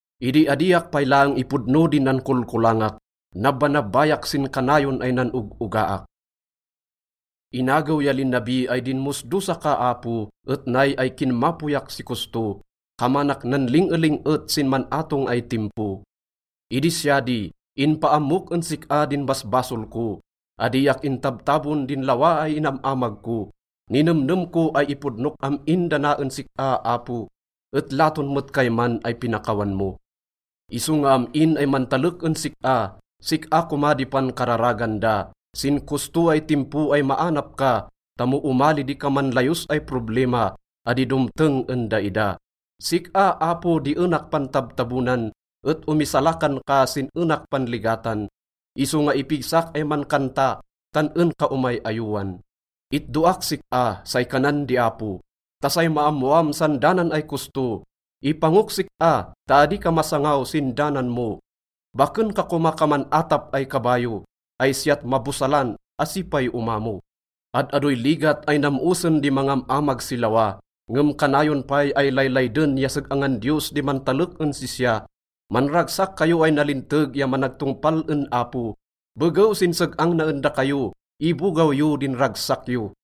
Idi adiak pay laeng ipodno din nankolkolangak, nabbanabbayak sin kanayon ay nan-og-ogaak. Inagew ya linabi ay dinmosdosa ka, Apo, et nay ay kinmapoyak si kosto, kamanak nanling-eling-et sin man-atong ay timpo. Idi siya di, inpaammok en sik-a din basbasol ko, adiak intabtabon din lawa ay inam-amag ko. Ninemnem ko ay ipodnok am-in da na en sik-a, Apo, et laton met kayman ay pinakawan mo. Isonga am-in ay mantalek en sik-a, sik-a koma di pankararagan da sin kosto ay timpo ay maanap ka, ta mo omali di kaman layos ay problima, adi domteng en daida. Sik-a, Apo, di enak pantabtabonan et omisalakan ka sin enak panligatan, isonga ipigsak ay mankanta tan en ka omay-ayowan. “Itdoak sik-a,” say kanan di Apo, “ta say maammoam san danan ay kosto. Ipangok sik-a ta adi ka masangaw sin danan mo. Baken ka koma kaman atap ay kabayo ay siyat mabosalan asi pay omamo.” Ad-adoy ligat ay nam-osen di mangam-amag si lawa, ngem kanayon pay ay laylayden ya seg-angan Diyos di mantalek en sisya. Manragsak kayo ay nalinteg ya managtongpal en Apo. Begew sin seg-ang na en dakayo, ibogaw yo din ragsak yo.